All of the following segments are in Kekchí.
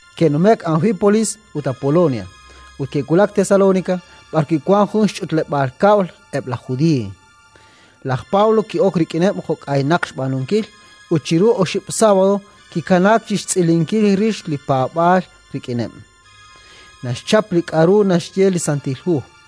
Ke'nume'k Anfípolis ut Apolonia, ut ke'wulak Tesalónika b'arwi' wank jun xch'utleb'aal kab'l eb' laj Judiiy. Laj Pablo ki'ok rik'ineb' jo' k'aynaq xb'aanunkil, ut chiru oxib' sábado kikanaak chi xtz'ilinkil rix li paab'aal rik'ineb': naxchap li k'aru naxye li Santil Hu,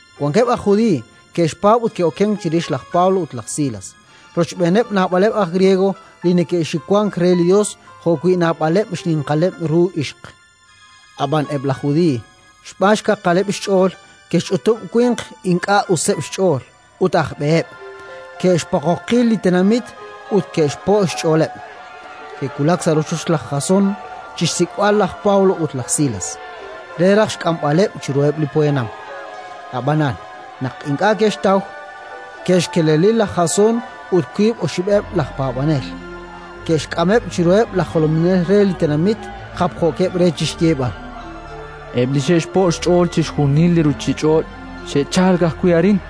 Wankeb' aj Judiiy ke'xpaab' ut ke'okenk chirix laj Pablo ut laj Silas, rochb'eeneb' naab'aleb' aj Griego li neke'xiwank re li Yos jo'wi' naab'aleb' xninqaleb' ru ixq. Ab'an eb' laj Judiiy xb'aan xkaqaleb' xch'ool ke'xch'utub' winq ink'a' useb' xch'ool ut aj b'eheb', ke'xpoqoqi li tenamit ut ke'xpo' xch'ooleb'. Ke'wulak sa' rochoch laj Jasón chi xsik'b'al laj Pablo ut laj Silas, re raj xk'amb'aleb' chiruheb' li poyanam. Ab'anan, naq ink'a' ke'xtaw, ke'xkeleli laj Jasón ut wiib' oxib'eb' laj paab'anel, ke'xk'ameb' chiruheb' laj jolominel re li tenamit, japjookeb' re chi xyeeb'al: —Eb' li xe'xpo' xch'ool chixjunil li ruuchich'och' xe'chalk ajwi' arin,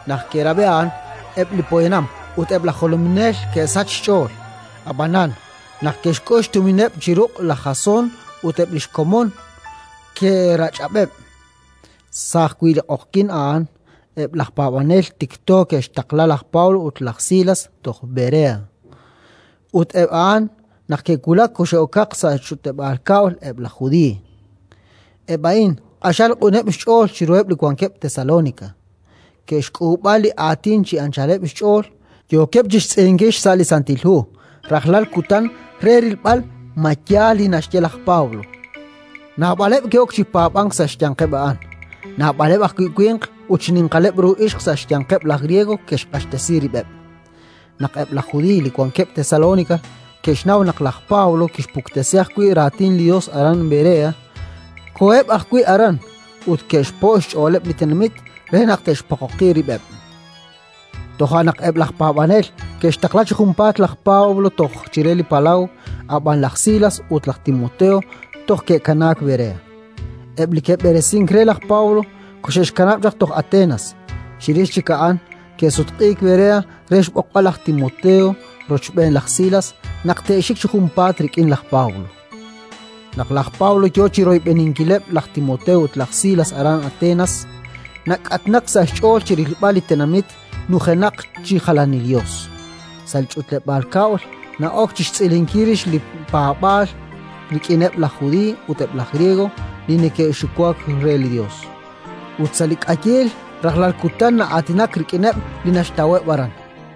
Naq ke'rab'i a'an, eb' li poyanam ut eb' laj jolominel ke'sachk xch'ool; ab'anan, naq ke'xk'ul xtumineb' chi ruq' laj Jasón ut eb' li xkomon, ke'rach'ab'eb'. Sa' ajwi' li q'oqyink a'an, eb' laj paab'anel tikto ke'xtaqla laj Pablo ut laj Silas toj Berea. Ut eb' a'an, naq ke'wulak, koxe'okaq sa' xch'utleb'aal kab'l eb' laj Judiiy. Eb' a'in q'axal q'uneb' xch'ool chiruheb' li wankeb' Tesalónika: ke'xk'ulub'a li Aatin chi anchaleb' xch'ool, yookeb' chi xtz'ilinkil xsa' li Santil Hu rajlal kutan re rilb'al ma yaal li naxye laj Pablo. Naab'aleb' ke'ok chi paab'ank sa' xyanqeb' a'an. Naab'aleb' ajwi' winq ut xninqaleb' ru ixq sa' xyanqeb' laj Griego ke'xq'axtesi rib'eb'. Naq eb' laj Judiiy li wankeb' Tesalónika ke'xnaw naq laj Pablo kixpuktesi ajwi' Raatin li Yos aran Berea, koheb' ajwi' aran ut ke'xpo' xch'ooleb' li tenamit re naq te'xpoqoqi rib'eb'. Toja' naq eb' laj paab'anel ke'xtaqla chi junpaat laj Pablo toj chire li palaw; ab'an laj Silas ut laj Timoteo toj ke'kanaak Berea. Eb' li ke'b'eresink re laj Pablo koxe'xkanab' toj Atenas; chirix chik a'an ke'sutq'iik Berea re xb'oqb'al laj Timoteo rochb'een laj Silas naq te'xik chi junpaat rik'in laj Pablo. Naq laj Pablo yo chi royb'eninkileb' laj Timoteo ut laj Silas aran Atenas, nak'atnak sa' xch'ool chi rilb'al li tenamit nujenaq chi jalanil yos. Sa' li ch'utleb'aal kab'l na'ok chi xtz'ilinkil rix li paab'aal rik'ineb' laj Judiiy ut eb' laj Griego li neke'xiwank re li Yos, ut sa' li k'ayiil rajlal kutan na'aatinak rik'ineb' li naxtaweb' aran.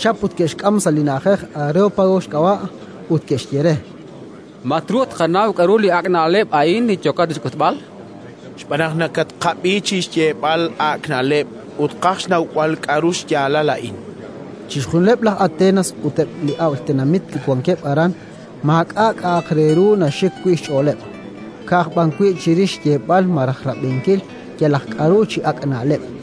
Ke'xchap ut ke'xk'am sa' li na'ajej Areópago xk'ab'a', ut ke'xye re: —Ma truuq tqanaw k'aru li ak' na'leb' a'in li yookat chi xk'utb'al? Xb'aan naq nakatqab'i chi xyeeb'al ak' na'leb' ut tqaj xnawb'al k'aru xyaalal a'in. Chixjunileb' laj Atenas ut eb' laj ab'l tenamit li wankeb' aran maak'a' k'a'aq re ru naxik wi' xch'ooleb', ka'aj b'an wi' chirix xyeeb'al malaj rab'inkil yalaq k'aru chi ak' na'leb'.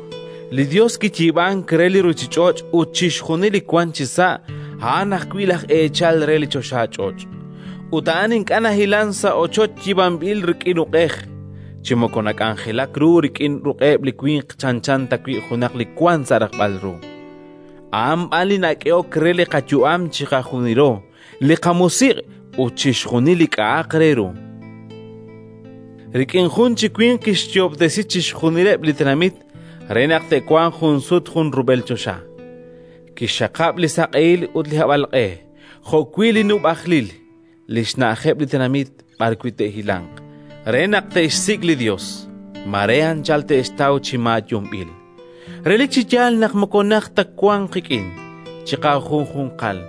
“Li Yos li kiyiib'ank re li ruuchich'och' ut chixjunil li wank chisa', a'an ajwi' laj eechal re li choxach'och'. Ut a'an ink'a' nahilank sa' ochoch yiib'anb'il rik'in uq'ej, chi moko nak'anjelaak ru rik'in ruq'eb' li winq chanchan tawi' junaq li wank sa' rajb'al ru: a'an b'an li nak'ehok re li qayu'am chiqajunilo, li qamusiq' ut chixjunil li k'a'aq re ru. “Rik'in jun chi winq kixyoob'tesi chixjunileb' li tenamit re naq te'wanq junsut junrub'el choxa. Kixxaqab' li saq'ehil ut li hab'alq'e, jo'wi' li xnub'ajlil li xna'ajeb' li tenamit b'arwi' te'hilanq, re naq te'xsik' li Yos: mare anchal te'xtaw chi maayunb'il. Relik chi yaal naq moko najt ta wank qik'in chiqajunjunqal,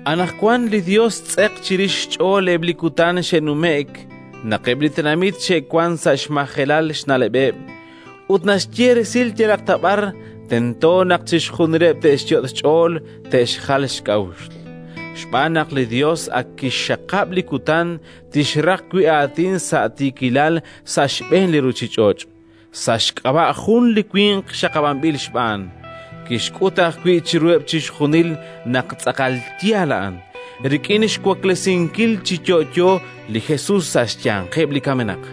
Anaqwan li Yos xtz'eq chirix xch'ool eb' li kutan xe'numje'k, naq eb' li tenamit xe'wank sa' xmajelal xna'leb'eb', ut naxye resil naq yalaq b'ar tento naq chixjunileb' te'xyot' xch'ool te'xjal xk'a'uxl. Xb'aan naq li Yos ak kixxaqab' li kutan tixraq wi' aatin sa' tiikilal sa' xb'een li ruuchich'och', sa' xk'ab'a' jun li winq xaqab'anb'il xb'aan. Kixk'ut ajwi' chiruheb' chixjunil naq tz'aqal yaal a'an, rik'in xwaklesinkil chi yo'yo li Jesus sa' xyanqeb' li kamenaq”.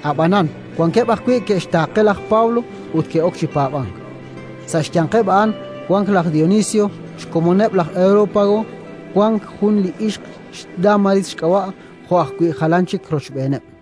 Ab'anan wankeb' ajwi' ke'xtaaqe laj Pablo ut ke'ok chi paab'ank: sa' xyanqeb' a'an wank laj Dionisio, xkomoneb' laj Areópago, wank jun li ixq xDámaris xk'ab'a', jo' ajwi' jalan chik rochb'eeneb'.